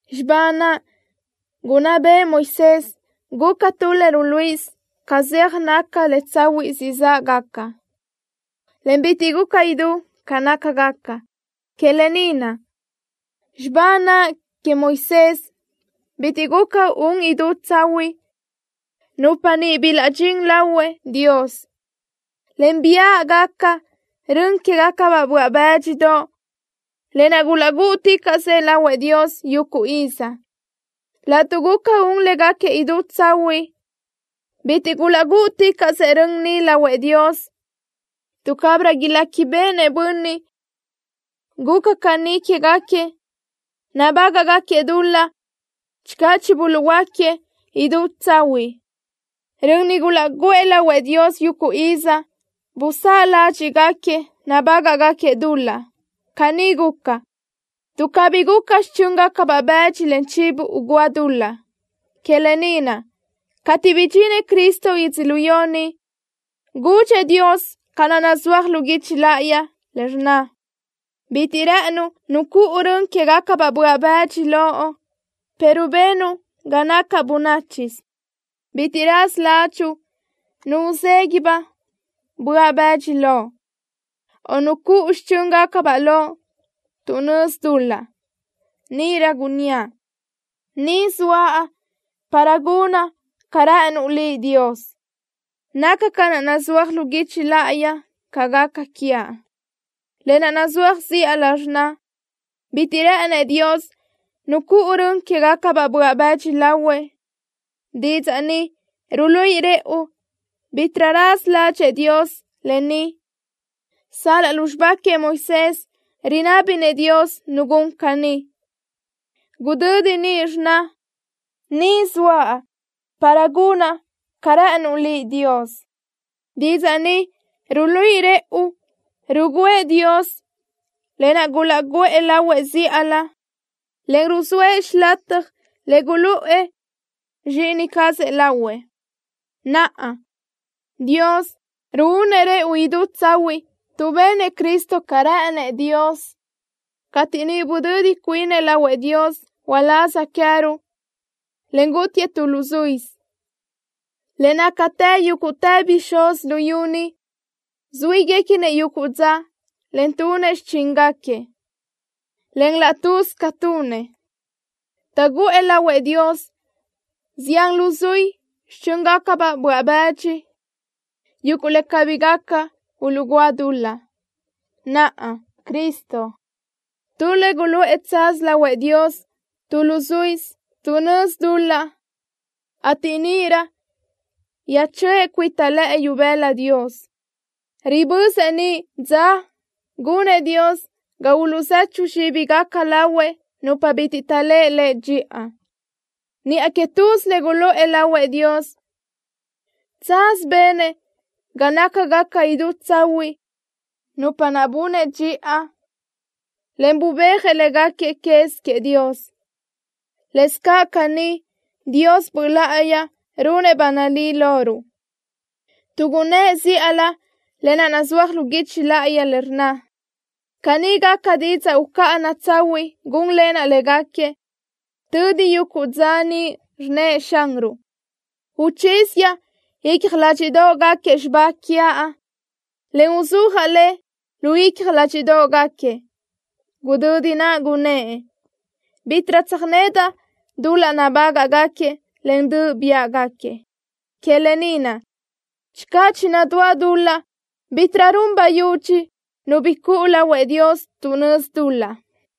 Xibá naʼ gunná bëʼë Moisés guca tu le ruluíʼisö ca zeaj naca le tsahuiʼ siʼ záʼgaca, en bitiʼ guca idú ca nácagaca. Que lë ni naʼ, xibá naʼ queëʼ Moisés bitiʼ guca un idú tsahuiʼ nupa niʼ bilaʼdxín lahuëʼ Dios, en biáʼgaca rön quégacabaʼ böaʼ bë́dxidoʼ, lë naʼ gulaʼgúʼuticaʼsëʼ lahuëʼ Dios yuguʼ iz. Laʼtuʼ guca un légaquiëʼ idú tsahuiʼ, bitiʼ gulaʼgúʼuticaʼsëʼ rön niʼ lahuëʼ Dios, tuʼ cabirö iléquibeʼenëʼ bönniʼ guca caní quégaquiëʼ nabágaʼgaquiëʼ dul-laʼ channö chibuluʼhuöáquiëʼ idú tsahuiʼ. Rön niʼ gulaʼguʼë lahuëʼ Dios yuguʼ iz busáʼ ládxiʼgaquiëʼ nabágaʼgaquiëʼ dul-laʼ. Caní guca, tuʼ cabí guca xichö́ngacabaʼ bëdxi, en chivo ugúa dul-laʼ. Que lë ni naʼ, cateʼ bidxinëʼ Cristo yödzölió ni, gudxëʼ Dios ca naʼ nazúaj lu guichi láʼayi le rnna: Bitiʼ rë́ʼënuʼ nu cuʼu rön quégacabaʼ böaʼ bëdxi loʼ pero benuʼ ga nacaʼ bönáchisö. Bitiʼ raza ládxuʼu nu uzeguiʼ-baʼ böaʼ bëdxi loʼ, o nu cuʼu xichö́ngacabaʼ loʼ tuʼ nözi dul-laʼ. Níʼirö gunníaʼ: Ni zoaʼ para gunaʼ ca rë́ʼënuʼ Liʼ, Dios. Naca ca naʼ nazúaj lu guichi láʼayi ca gaca quiaʼ. Lë naʼ nazúaj zíʼalö rnna: “Bitiʼ rë́ʼënëʼ Dios nu cuʼu rön quégacabaʼ böaʼ bëdxi lahuëʼ.” Didzaʼ ni ruluíʼi rëʼu bítiʼrö raza ládxëʼë Dios lë ni sal-laʼ lu xibá queëʼ Moisés rinná béʼenëʼ Dios nu gun caní. Gudödi niʼ rnna: “Ni zoaʼ para gunaʼ ca rë́ʼënuʼ Liʼ, Dios.” Didzaʼ ni ruluíʼi rëʼu rugǘëʼ Dios lë naʼ gulaʼguʼë lahuëʼ zíʼalö, en ruzóëʼ xilataj le guluʼë Zxíʼini cazëʼ lahuëʼ. Naʼa, Dios ruúnëʼ rëʼu idú tsahuiʼ tuʼ benëʼ Cristo ca rë́ʼënëʼ Dios cateʼ niʼ budödi cuinëʼ lahuëʼ Dios uláz queë́ruʼ, en gútiëʼ tu luzuísö. Le nácatë yúguʼtë bixúz luyú ni zuíguequinëʼ yuguʼ dza, en tunëʼ xichíngaquiëʼ, en laʼ tuz ca tunëʼ, taʼguʼë lahuëʼ Dios zián luzuí xichö́ngacabaʼ böaʼ bëdxi, yuguʼ le cabí gaca uluʼgúa dul-laʼ. Naʼa, Cristo, tu le guluʼë tsaz lahuëʼ Dios tu luzuísö tuʼ nözi dul-laʼ, ateʼ níʼirö yöjchöʼë cuita lëʼë ibëla Dios. Ribözëʼ niʼ dza gunëʼ Dios ga uluʼzechu zxíbigaca lahuëʼ nupa bitiʼ taʼléʼe Lëʼ dxiʼa. Niʼa que tuz le guluʼë lahuëʼ Dios, tsaz benëʼ ga nácagaca idú tsahuiʼ nupa naʼ bunëʼ dxiʼa, en bubéajëʼ léguequi quez queëʼ Dios. Lëscaʼ caní Dios Böʼ Láʼayi runëʼ ba nalí loruʼ, tuʼ gunnë́ʼ zíʼalö lë naʼ nazúaj lu guichi le rnna: Caní gaca didzaʼ ucáʼana tsahuiʼ gúnlenaʼ légaquiëʼ tödi yuguʼ dza niʼ, rnnëʼ Xanruʼ. Uchíziaʼ icja ládxiʼdoʼgaquiëʼ xibá quiaʼ, en uzúajaʼ le lu icja ládxiʼdoʼgaquiëʼ. Gudödi naʼ gunnë́ʼ: Bítiʼrö tsöjnedaʼ dul-laʼ nabágaʼgaquiëʼ en döʼ biáʼgaquiëʼ. Que lë ni naʼ, channö chinadúa dul-laʼ, bítiʼrö run bayudxi nu bi cuʼu lahuëʼ Dios tuʼ nözi dul-laʼ.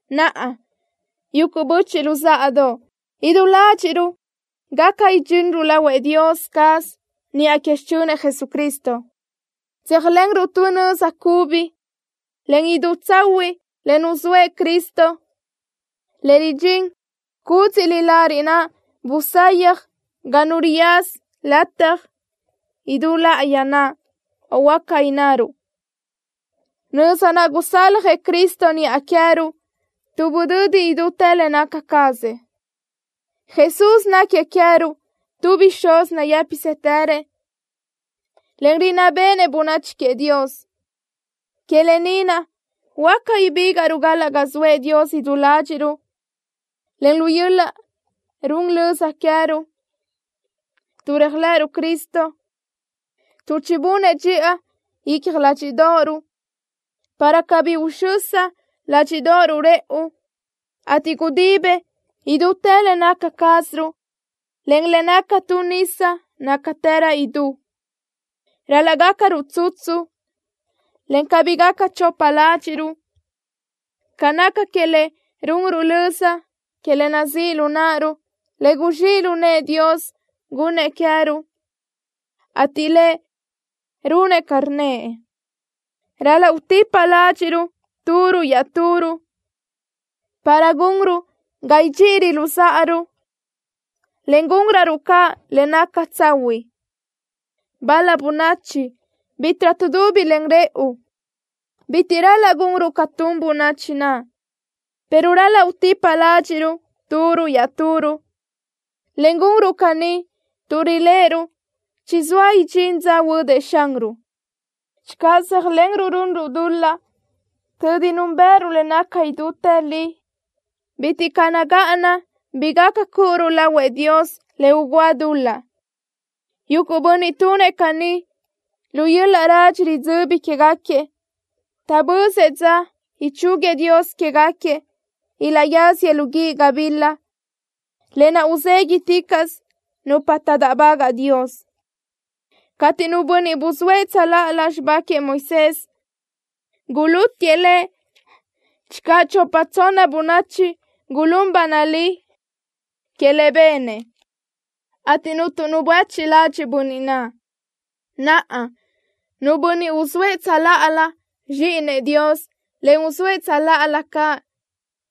Naʼa, yuguʼ böchiʼ luzáʼadoʼ, idú ládxiʼruʼ gaca idxinruʼ lahuëʼ Dios caz, niʼa que xichönëʼ Jesucristo. Tséajlenruʼ tu nöza cubi, en idú tsahuiʼ le nuzóëʼ Cristo, le ridxín cúdziʼlö lariʼ naʼ busayaj ga nu riyaza lataj idú láʼayi naʼ, o huáca innaruʼ, nöza naʼ gusaljëʼ Cristo niʼa queë́ruʼ tuʼ budödëʼ idútë le naca cazëʼ. Jesús náquiëʼ queë́ruʼ tu bixúz nayë́pisëtërëʼ, en rinná béʼenëʼ bönachi queëʼ Dios. Que lë ni naʼ huáca ibígaʼruʼ galaʼ ga zoëʼ Dios idú ládxiʼruʼ, en lu yöl-laʼ run löza queë́ruʼ, tuʼ réajlëʼëruʼ Cristo, tuʼ chibunëʼ dxiʼa icja ládxiʼdoʼoruʼ, para cabí uxösa ládxiʼdoʼoruʼ rëʼu, ateʼ gudibëʼ idútë le naca cázaruʼ len le naca tu nisa nácatërö idú. Ral-laʼ gácaruʼ tsutsu, en cabí gaca chopa ládxiʼruʼ ca naca le runruʼ löza que le nazíʼ lu náʼaruʼ, le guzxíʼ lu nëʼë Dios gunnëʼ queë́ruʼ, ateʼ Lëʼ runëʼ ca rnnëʼ. Ral-laʼ utipa ládxiʼruʼ turuʼ iaʼturuʼ, para gunruʼ ga idxíʼiröruʼ luzáʼaruʼ, en gúnröruʼ caʼ le naca tsahuiʼ. Bal-la bönachi bítiʼrö tuʼdubi len rëʼu. Bitiʼ ral-laʼ gunruʼ ca tun bönachi naʼ, pero ral-laʼ utipa ládxiʼruʼ turuʼ iaʼturuʼ, en gúnröruʼ caní tuʼ riléʼeruʼ chizóa idxín dza huödëʼ Xanruʼ. Channö zéajlenruʼ runruʼ dul-laʼ tödi núnbëʼëruʼ le naca idútë li, bitiʼ caʼ nagáʼana bi gaca cúʼuruʼ lahuëʼ Dios le ugúa dul-laʼ. Yuguʼ bönniʼ tunëʼ caní, lu yöl-laʼ radxi ridzöbi quégaquiëʼ taʼbözëʼ dza ichúguiëʼ Dios quégaquiëʼ ilaʼyáziëʼ lu guíʼ gabila, lë naʼ uzéguiticaʼsö nupa taʼdáʼbagaʼ Dios. Cateʼ nu bönniʼ buzóëʼ xibá queëʼ Moisés tsöláʼalö, gulútiëʼ lëʼ channö chopa tsonna bönachi gulún ba nalí que le benëʼ, ateʼ cuntu nu buéchiʼ ladxiʼ bönniʼ naʼ. Naʼa, nu bönniʼ uzóëʼ tsöláʼalö Zxíʼinëʼ Dios, en uzóëʼ tsöláʼalö caʼ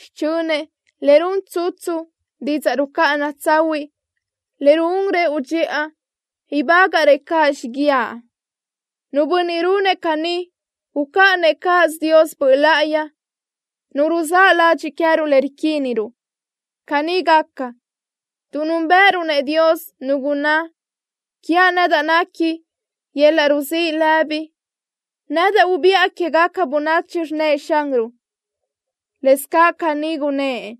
xichönëʼ le run tsutsu didzaʼ rucáʼana tsahuiʼ, le ruún rëʼu dxiʼa, ibágaʼrëʼ caʼ xíguiaʼ. Nu bönniʼ gunëʼ caní ucáʼanëʼ cáʼasö Dios Böʼ Láʼayi, Nu ruzáʼ ladxiʼ queë́ruʼ le riquíniruʼ. Caní gaca, tuʼ núnbëʼëruʼ-nëʼ Dios, Nu gunná: “Quiaʼ nedaʼ nequi yöl-laʼ ruzíʼ lëbi. Nedaʼ ubiʼa quégaca bönachi, rnnëʼ Xanruʼ.” Lëscaʼ caní gunnë́ʼ: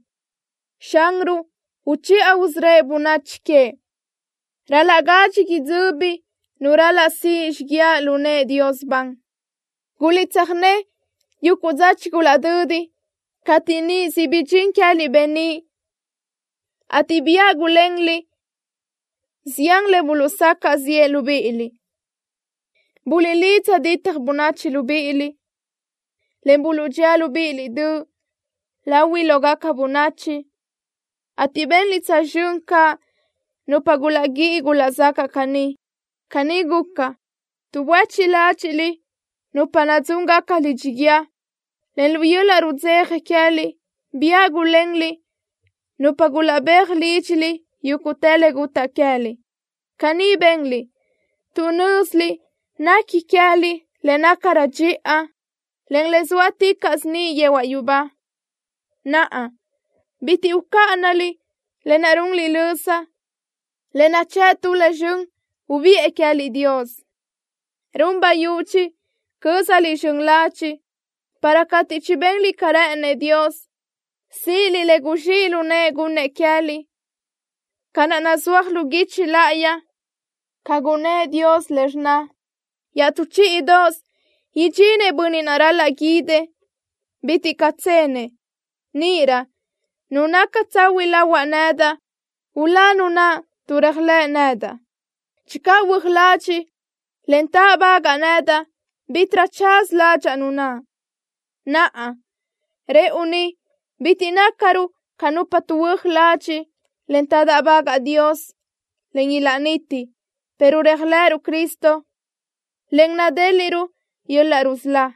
“Xanruʼ uchiʼa usörö́ëʼ bönachi queëʼ.” Ral-laʼ gadxi idzöbi nu ral-laʼ siʼ xíguiaʼ lu nëʼë Dios ban. Guliʼtsöjné yuguʼ dza chigulaʼdödi cateʼ niʼ siʼ bidxín queë́liʼ beníʼ, ateʼ biáʼ gulenliʼ zián le buluʼsacaʼ ziʼë libíʼiliʼ. Buluʼlidza ditaj bönachi libíʼiliʼ, en buluʼdxía libíʼiliʼ döʼ lahuiʼ lógaca bönachi, ateʼ benliʼ tsözxö́n caʼ nupa gulaʼguíʼi gulaʼzacaʼ caní. Caní guca, tuʼ buéchiʼ ládxiʼliʼ nupa nadzúngaca lidxi guíë, en lu yöl-laʼ rudzeja queë́liʼ biáʼ gulenliʼ nupa gulaʼbéaj lídxiliʼ yuguʼ le gutaʼ queë́liʼ. Caní benliʼ tuʼ nö́ziliʼ nequi queë́liʼ le nácarö dxiʼa, en le zóaticaʼsö niʼ yehuaʼ yubá. Naʼa, bitiʼ ucáʼanaliʼ lë naʼ runliʼ löza, le nachë́ʼ tu le zxön ubiʼë Dios queë́liʼ. Run bayudxi cö́zaliʼ zxön ladxiʼ, para cateʼ chibenliʼ ca rë́ʼënëʼ Dios, síʼiliʼ le guzxíʼ lu nëʼë gunnëʼ queë́liʼ, ca naʼ nazúaj lu guichi láʼayi, ca gunnë́ʼ Dios le rnna: Iaʼtú chíʼidoʼosö idxinëʼ Bönniʼ naʼ ral-laʼ guídëʼ. Bitiʼ caʼ tsenëʼ. Níʼirö nu naca tsahuiʼ lahuaʼ nedaʼ, ulá nu naʼ tuʼ réajlëʼ nedaʼ. Channö huö́aj ladxiʼ, en táʼbagaʼ nedaʼ, bítiʼrö tsaz ládxaʼa nu naʼ. Naʼa, rëʼu ni, bitiʼ nácaruʼ ca nupa tuʼhuö́aj ladxiʼ, en taʼdáʼbagaʼ Dios, en ilaʼniti, pero réajlëʼëruʼ Cristo, en nadéliʼruʼ yöl-laʼ rusölá.